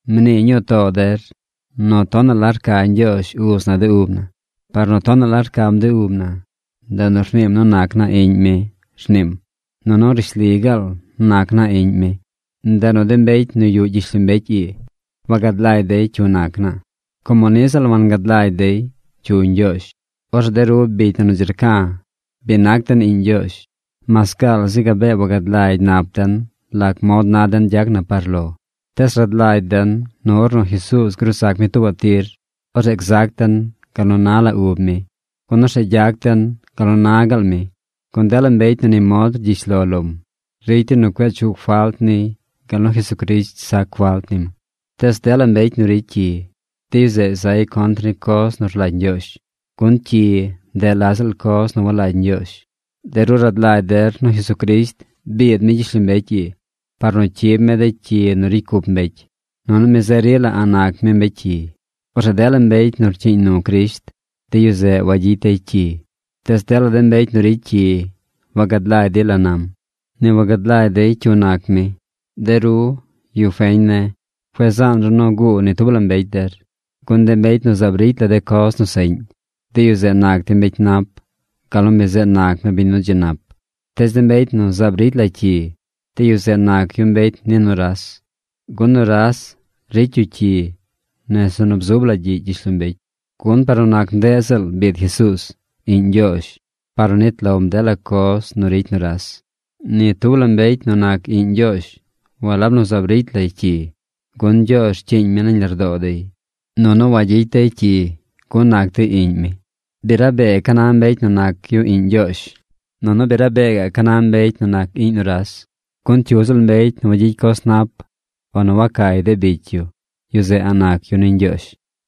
Mnii ñuu too der nu tonaꞌ la rca Ñgyoozh Uz na de ub na. Par nu tonaꞌ la rcam de ub na, ndeꞌ nu rniim nu nac naa iꞌñ mi, rniim. Nunu rishli gaal nac naa iꞌñ mi. Ndeꞌ nu de mbecy nu yuꞌ gyishlombecy ii wagad lagy dey cyu nac naa, como niꞌ ziꞌl wangad lagy dey cyu Ñgyoozh. Orzeꞌ de ru bicy na nu dzi rca̱, bi nac den iꞌñ Ñgyoozh. Mas gaal zi gabee wagad lagy nap den lac mod na den gyac na par lo, tees rad lagy den nu ornu Jesuuz gruu zac mi tuubaꞌ tir, orzeꞌ gzac den gal nu na la ub mi, gun orzeꞌ gyac den gal nu na gaal mi. Gun dela mbecy nu ni mod rgyish lo lom, ricy dey nu cueꞌ chuꞌ falt niy gal nu Jesucrisht sac falt nim. Tees dela mbecy nu ricy cyi, de yu zeꞌ zay contr ni coz nu rlagy Ñgyoozh. Gun cyi, ndeꞌ la ziꞌl coz nu walagy Ñgyoozh. De ru rad lagy der nu Jesucrisht biid mi gyishlombecy ii par nu cyib mi de cyi nu ricy cup mbecy. Nunu mi zeꞌ rila a̱ꞌ nac mi mbecy cyi. Orzeꞌ dela mbecy nu rcyiiñ nu Crisht, de yu zeꞌ wagyicy dey cyi. Tees dela de mbecy nu ricy cyi wagad lagy dey la nam. Ni wagad lagy dey cyu nac mi. De ru, yu feñ ne̱, cueꞌ zaan ru nu guu ni tub la mbecy der, gun de mbecy nu zaab ricy la de coz nu seꞌñ, de yu zeꞌ nac dey mbecy nap gal nu mi zeꞌ nac mi biñ nu dzi nap. Tees de mbecy nu zaab ricy la cyi, de yu zeꞌ nac yu mbecy ni nuras. Gun nuras ricy yu cyi nese nu bzub la gyiꞌ gyishlombecy. Gun par nu nac ndeꞌ ziꞌl biid Jesuuz, Iꞌñ Ñgyoozh, par nu nit lom dela coz nu ricy nuras. Ni tub la mbecy nu nac iꞌñ Ñgyoozh walab nu zaab ricy lay cyi, gun Ñgyoozh rcyiiñ mi nañ lardoo dey. Nunu wagyicy dey cyi, gun nac dey iꞌñ mi. Bi rabee ca na mbecy nu nac yu iꞌñ Ñgyoozh, nunu bi rabee gaꞌ ca na mbecy nu nac iꞌñ nuras, gun cyu ziꞌl mbecy nu wagyicy coz nap o nu wacay de bicy yu, yu zeꞌ a̱ꞌ nac yu ni Ñgyoozh.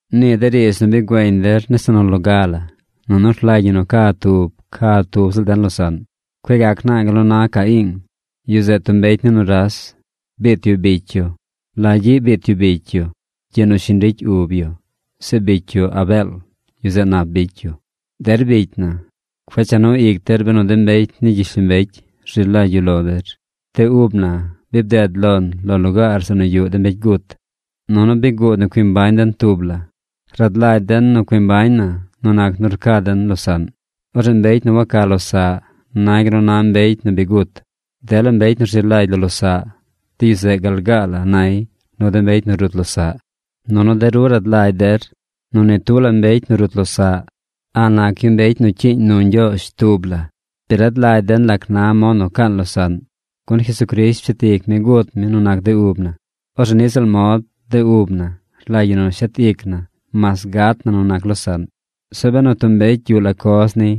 Nii de riidz nu bi güeñ der nese nu loga la: Nu rlagy ñi nu ca tub ca tub ziꞌl den losaꞌn. Cueꞌ gac naa gal nu na Caiing. Yu zeꞌ tub mbecy ni nuras. Biit yu bicy yu. ¿La gyiꞌ biit yu bicy yu? Gyiꞌ nu shiñ ricy ub yu. Zeꞌ bicy yu, Abeel, yu zeꞌ nap bicy yu. Der bicy na, cueꞌ cha nu ic der benu de mbecy ni gyishlombecy rzi lagy yu lo der. De ub na bi bded lon lo lugaar zeꞌ nu yuꞌ de mbecy gut. Nunu bi guud nu cui mbañ den tub la. Rad lagy den nu cui mbañ na nu nac nu rca den losaꞌn. Orzeꞌ mbecy nu waca losaꞌ nay gal nu na mbecy nu bi gut. Dela mbecy nu rzi lagy lo losaꞌ, de yu zeꞌ gal gaa la nay nu de mbecy nu rut losaꞌ. Nunu de ru rad lagy der nu ni tub la mbecy nu rut losaꞌ a̱ꞌ nac yu mbecy nu cyiiñ nu Ñgyoozh tub la. Bi rad lagy den lac na mod nu caan losaꞌn, gun Jesucrisht pshet ic mi gut mi nu nac de ub na. Orzeꞌ niꞌ ziꞌl mod, de ub na rlagy ñi nu shet ic na mas gat na nu nac losaꞌn. Zeꞌ benu tub mbecy yuꞌ la coz niy,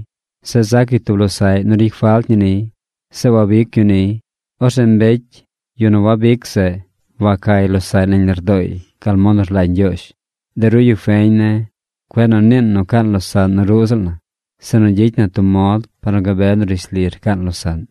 zeꞌ zac yu tub losaꞌy nu ricy falt ñi niy, zeꞌ wabic yu niy, orzeꞌ mbecy, yu nu wabic zeꞌ, wacay losaꞌy nañ lardooy gal mod nu rlagy Ñgyoozh. De ru yu feñ ne̱, cueꞌ nu niin nu caan losaꞌn nu ruꞌ ziꞌl na, sinu gyicy na tub mod par nu gabe nu rishli rcaan losaꞌn.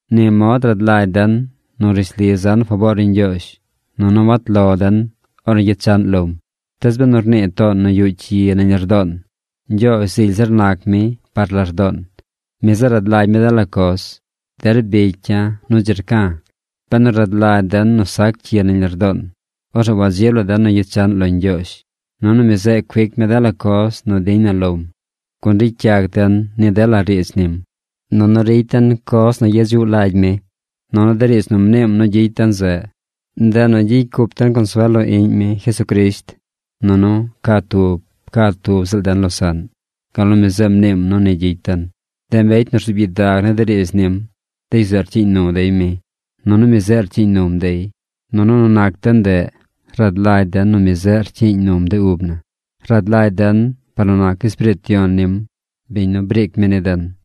Ni mod rad lagy den nu rishli zan faboor ni Ñgyoozh, nunu wat lo den ornu gyechaꞌn lom. Tees benu rnii toon nu yuꞌ cyi nañ lardoon, Ñgyoozh zily zir nac mi par lardoon. Mi zeꞌ rad lagy mi dela coz. Der bicya̱ nu dzi rca̱, benu rad lagy den nu sac cyi nañ lardoon, orzeꞌ wadzib la den nu gyechaꞌn lo Ñgyoozh. Nunu mi zeꞌ cuic mi dela coz nu diñ na lom, gun ricy yac den ni dela riidz nim. Nunu ricy den coz nu yedzuꞌ lagy mi. Nunu de riidz nu mniim nu gyicy den zeꞌ, ndeꞌ nu gyicy cup den consuel lo Iꞌñ mi, Jesucrisht, nunu ca tub ca tub ziꞌl den losaꞌn, gal nu mi zeꞌ mniim nu ni gyicy den. De mbecy nu rzuub gyidag ni de riidz nim, de yu zeꞌ rcyiiñ nu dey mi, nunu mi zeꞌ rcyiiñ num dey. Nunu nu nac de ndeꞌ, rad lagy den nu mi zeꞌ rcyiiñ num de ub na. Rad lagy den par nu nac Espiriit Yon nim, biñ nu briic mi ni den.